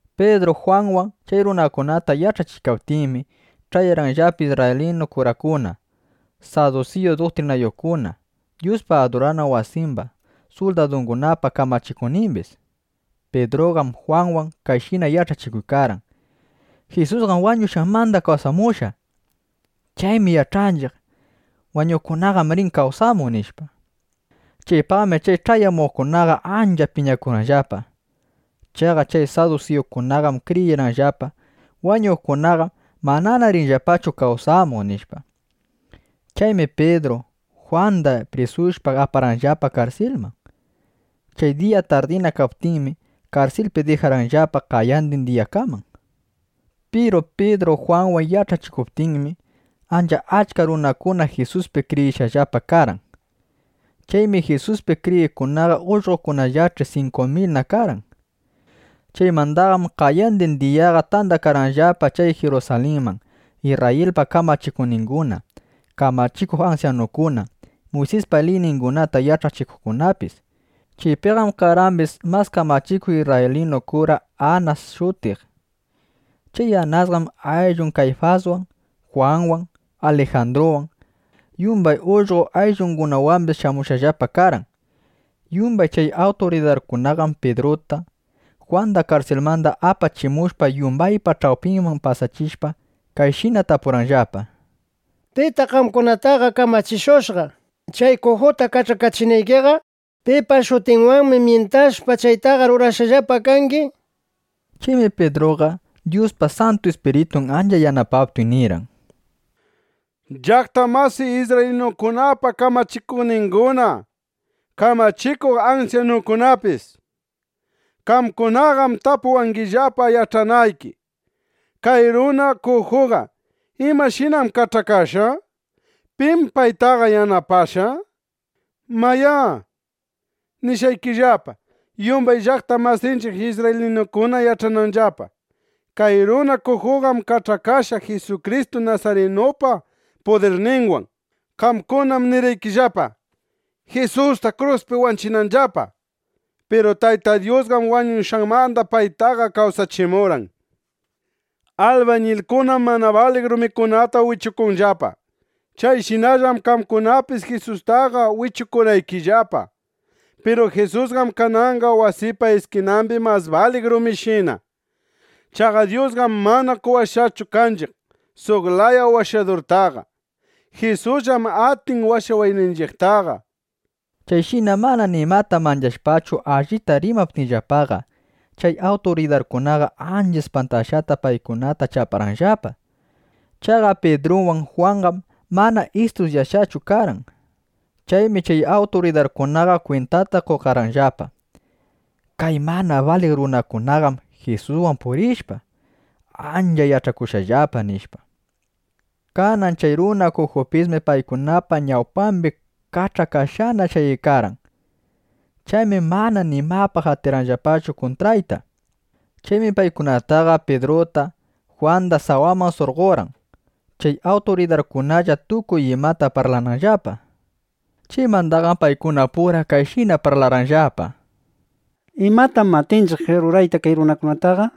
Pidru Jwanwan chay runakunata yach'achiykaptinmi, ch'ayarqanllapa isrraylinu kurakuna, sadusiyu duktrinayuqkuna, Dyuspa adurana wasimba suldadungunapa kamachikuqnimbis. Pidruqam Jwanwan kayshina yach'achikuykarqan: —Jisusqam wañushqanmanda, kawsamushqa. Chaymi yach'anchiq: Wañuqkunaqam rin kawsamuq, nishpa. Chaypaqmi chay ch'ayamuqkunaqa ancha piñakurqanllapa. (Chaqa chay sadusiyukunaqam kriyirqanllapa: Wañuqkunaqam mana rinllapachu kawsamuq, nishpa.) Chaymi Pidruta Jwanda prisushpa, aparqanllapa karsilman. Chay diya tardina kaptinmi, karsilpi dijarqanllapa qayandin diyakaman. Piru Pidru Jwanwan yach'achikuptinmi, ancha achka runakuna Jisuspi kriyishqallapa karqan. Chaymi Jisuspi kriyiqkunaqa ullqokunallach'i 5.000na karqan. Chaymandaqam qayandin diyaqa tandakarqanllapa chay Jirusalinman Isrrayilpa kamachikuqninguna, kamachikuq ansyanukuna, Muysispa liyningunata yach'achikuqkunapis. Chaypiqam karqambis mas kamachikuq isrraylinu kura Anas shutiq. Chay Anasqam ayllun Kayfaswan, Jwanwan, Alijandruwan, yumbay ullqo ayllungunawambis shamushqallapa karqan. Yumbay chay awturidarkunaqam Pidruta, Jwanda karsilmanda apachimushpa, yumbaypa ch'awpinman pasachishpa, kayshina tapurqanllapa: —¿Pitaq qamkunataqa kamachishushqa, chay kujuta kach'akachinaykiqa? ¿Pipa shutinwanmi myintashpa, chaytaqa rurashqallapa kangi? nishpa. Chaymi Pidruqa, Dyuspa Santu Ispiritun ancha yanapaptin, nirqan: —Llaqta masiy isrraylinukunapa kamachikuqninguna, kamachikuq ansyanukunapis, qamkunaqam tapuwangillapa yach'anayki: Kay runa kujuqa ¿imashinam kach'akashqa? ¿Pim paytaqa yanapashqa? nishpa. Mayá, nishqaykillapa, yumbay llaqta masinchiq isrraylinukuna yach'ananllapa. Kay runa kujuqam kach'akashqa Jisukristu nasarinupa pudirninwan. Qamkunam nirqaykillapa, Jisusta kruspi wanchinanllapa. Piru Tayta Dyusqam wañushqanmanda paytaqa kawsachimurqan. Albañilkunam mana baliq rumikunata wichukunllapa. Chayshinallam qamkunapis Jisustaqa wichukurqaykillapa. Piru Jisusqam kananqa wasipa iskinambi mas baliq rumishina. Chaqa Dyusqam mana qowashqachu kanchiq suq laya washadurtaqa. Jisusllam atin washawayninchiqtaqa, nishpa. Chayshina mana nimata manchashpachu allita rimaptinllapaqa, chay awturidarkunaqa ancha ispantashqata paykunata chaparqanllapa. Chaqa Pidruwan Jwanqam mana istudyashqachu karqan. Chaymi chay awturidarkunaqa kwintata qokarqanllapa: Kay mana baliq runakunaqam Jisuswan purishpa, ancha yach'akushqallapa, nishpa. Kanan chay runa kujupismi paykunapa ñawpambi kach'akashqana shayaykarqan. Chaymi mana nimapaq atirqanllapachu kuntraytaqa. Chaymi paykunaqa Pidruta, Jwanda sawaman surqorqan, chay awturidarkunalla tukuy imata parlananllapa. Chaymandaqam paykunapura kayshina parlarqanllapa: —¿Imatam atinchiq rurayta kay runakunataqa?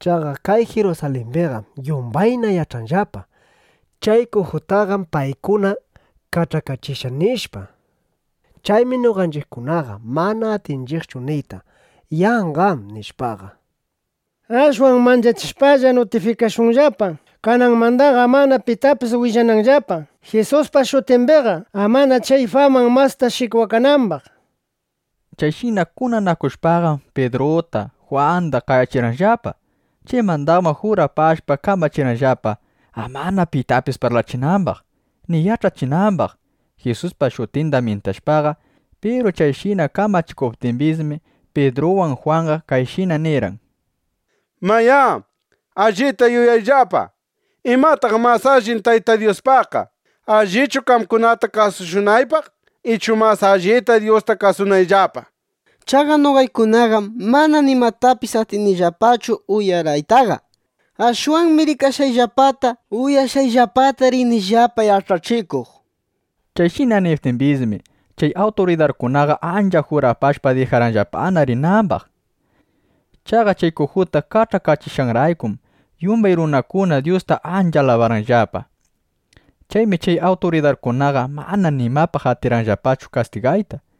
Chaqa kay Jirusalimbiqam yumbayna yach'anllapa: Chay kujutaqam paykuna kach'akachishqa, nishpa. Chaymi noqanchiqkunaqa mana atinchiqchu niyta “Yanqam”, nishpaqa. Ashwan manchachishpalla, nutifikashunllapa, kananmandaqa amana pitapis willananllapa Jisuspa shutimbiqa, amana chay faman masta shikwakanambaq, nishpa. Chayshina kunanakushpaqam, Pidruta Jwanda qayachirqanllapa. Chaymandaqam jurapashpa, kamachirqanllapa, amana pitapis parlachinambaq, ni yach'achinambaq, Jisuspa shutinda myintashpaqa. Piru chayshina kamachiptimbismi, Pidruwan Jwanqa kayshina nirqan: —Mayá, allita yuyayllapa. ¿Imataq mas alli Tayta Dyuspaqqa? ¿Allichu qamkunata kasushunaypaq, ichu mas alli Dyusta kasunayllapa? Chaqa noqaykunaqam mana nimatapis atinillapachu uyaraytaqa. Ashwanmi rikashqayllapata, uyashqayllapata rinillapa yach'achikuq, nishpa. Chayshina niptimbismi, chay awturidarkunaqa ancha jurapashpa, dijarqanllapana rinambaq. Chaqa chay kujuta kach'akachishqanraykum, yumbay runakuna Dyusta ancha alabarqanllapa. Chaymi chay awturidarkunaqa mana nimapaq atirqanllapachu kastigayta.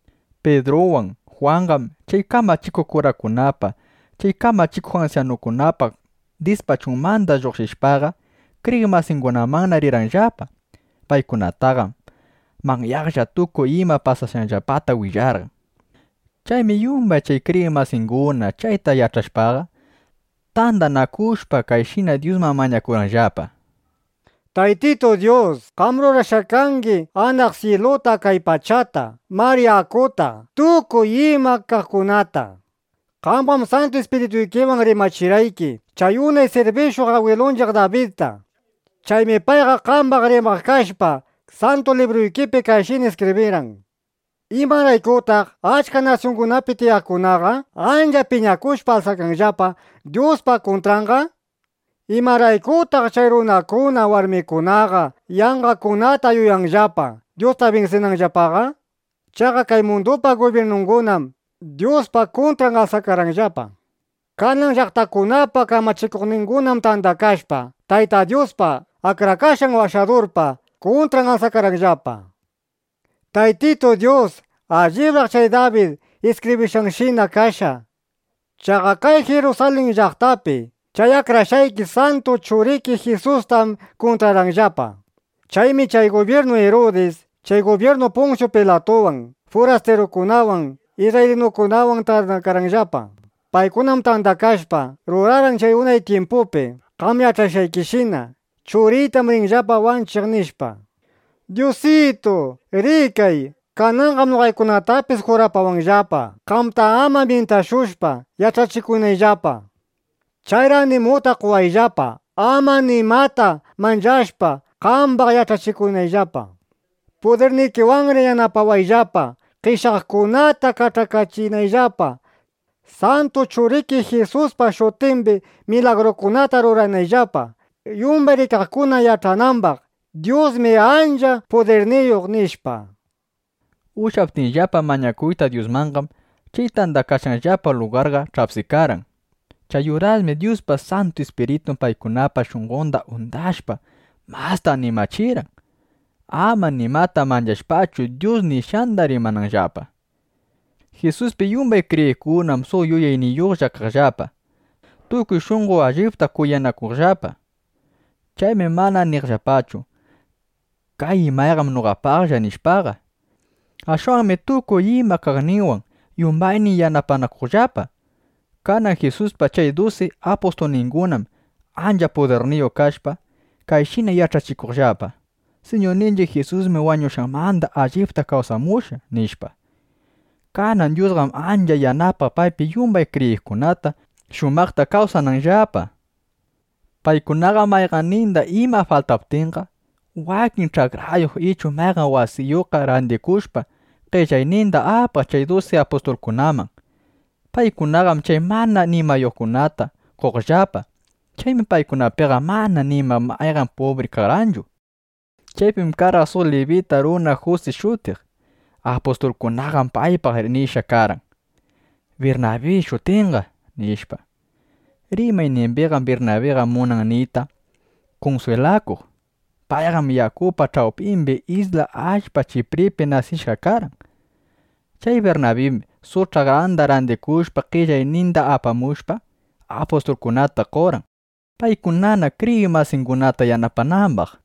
Pidruwan Jwanqam chay kamachikuq kurakunapa, chay kamachikuq ansyanukunapa dispachunmanda lluqshishpaqa, kriyiq masingunamanna rirqanllapa. Paykunataqam manyaqlla tukuy ima pasashqanllapata willarqan. Chaymi yumbay chay kriyiq masinguna chayta yach'ashpaqa, tandanakushpa, kayshina Dyusman mañakurqanllapa: —Taytitu Dyus, qam rurashqa kangi anaq syiluta, kay pachata, mar yakuta, tukuy ima kaqkunata. Qamqam Santu Ispirituykiwan rimachirqayki chay unay sirbishuq agwilunchiq Dabidta. Chaymi payqa qambaq rimaq kashpa, Santu Libruykipi kayshina iskibrirqan: ¿Imaraykutaq achka nasyungunapi tiyaqkunaqa ancha piñakushpa alsakanllapa Dyuspa kuntranqa? ¿Imaraykutaq chay runakuna, warmikunaqa yanqakunata yuyanllapa, Dyusta binsinanllapaqa? Chaqa kay mundupa gubyirnungunam Dyuspa kuntran alsakarqanllapa. Kanan llaqtakunapa kamachikuqningunam tandakashpa, Tayta Dyuspa, Akrashqan Washadurpa kuntran alsakarqanllapa, nishpa. ’Taytitu Dyus, allibraq chay Dabid iskibrishqanshina kashqa. Chaqa kay Jirusalin llaqtapi chay akrashqayki santu Churiki Jisustam kuntrarqanllapa. Chaymi chay gubyirnu Irudis, chay gubyirnu Punsyu Pilatuwan, furastirukunawan, isrraylinukunawan tandakarqanllapa. Paykunam tandakashpa, rurarqan chay unay tyimpupi qam yach'ashqaykishina: “Churiytam rinllapa wanchiq”, nishpa. Dyusitu, rikay, kananqam noqaykunatapis jurapawanllapa, qamta ama myintashushpa, yach'achikunayllapa. Chayri animuta qowayllapa, ama nimata manchashpa, qambaq yach'achikunayllapa. Pudirnikiwanri yanapawayllapa, qeshyaqkunata kach'akachinayllapa, santu Churiki Jisuspa shutimbi milagrukunata ruranayllapa, yumbay rikaqkuna yach'anambaq: Dyusmi ancha pudirniyuq, nishpa. Ushyaptinllapa mañakuyta Dyusmanqam, chay tandakashqanllapa lugarqa ch'apsikarqan. Chay urasmi Dyuspa Santu Ispiritun paykunapa shunqonda undashpa, masta animachirqan, ama nimata manchashpachu, Dyus nishqanda rimananllapa. Jisuspi yumbay kriyiqkunam suq yuyayniyuqlla kaqllapa. Tukuy shunqo allipta kuyanakuqllapa. Chaymi mana niqllapachu: “Kay imayqam noqapalla” nishpaqa. Ashwanmi tukuy ima kaqninwan yumbaynin yanapanakuqllapa. Kanan Jisuspa chay dusi apustulningunam ancha pudirniyuq kashpa, kayshina yach'achikuqllapa: “Siñurninchiq Jisusmi wañushqanmanda allipta kawsamushqa”, nishpa. Kanan Dyusqam ancha yanapaq paypi yumbay kriyiqkunata, shumaqta kawsananllapa. Paykunaqam mayqanninda iman faltaptinqa, wakin ch'akrayuq ichu mayqan wasiyuqqa randikushpa, qellayninda apaq chay dusi apustulkunaman. Paykunaqam chay mana nimayuqkunata qoqllapa. Chaymi paykunapiqa mana ni mayqan pubriqa karqanchu. Chaypim karqan suq libita runa Jusi shutiq. Apustulkunaqam paypaq nishqa karqan: “Birnabi shutinqa”, nishpa. Rimaynimbiqam Birnabiqa munan niyta “Kunswilakuq”. Payqam yakupa ch'awpimbi isla allpa Chipripi nasishqa karqan. Chay Birnabim suq ch'akranda randikushpa, qellayninda apamushpa, apustulkunata qorqan, paykunana kriyiq masingunata yanapanambaq.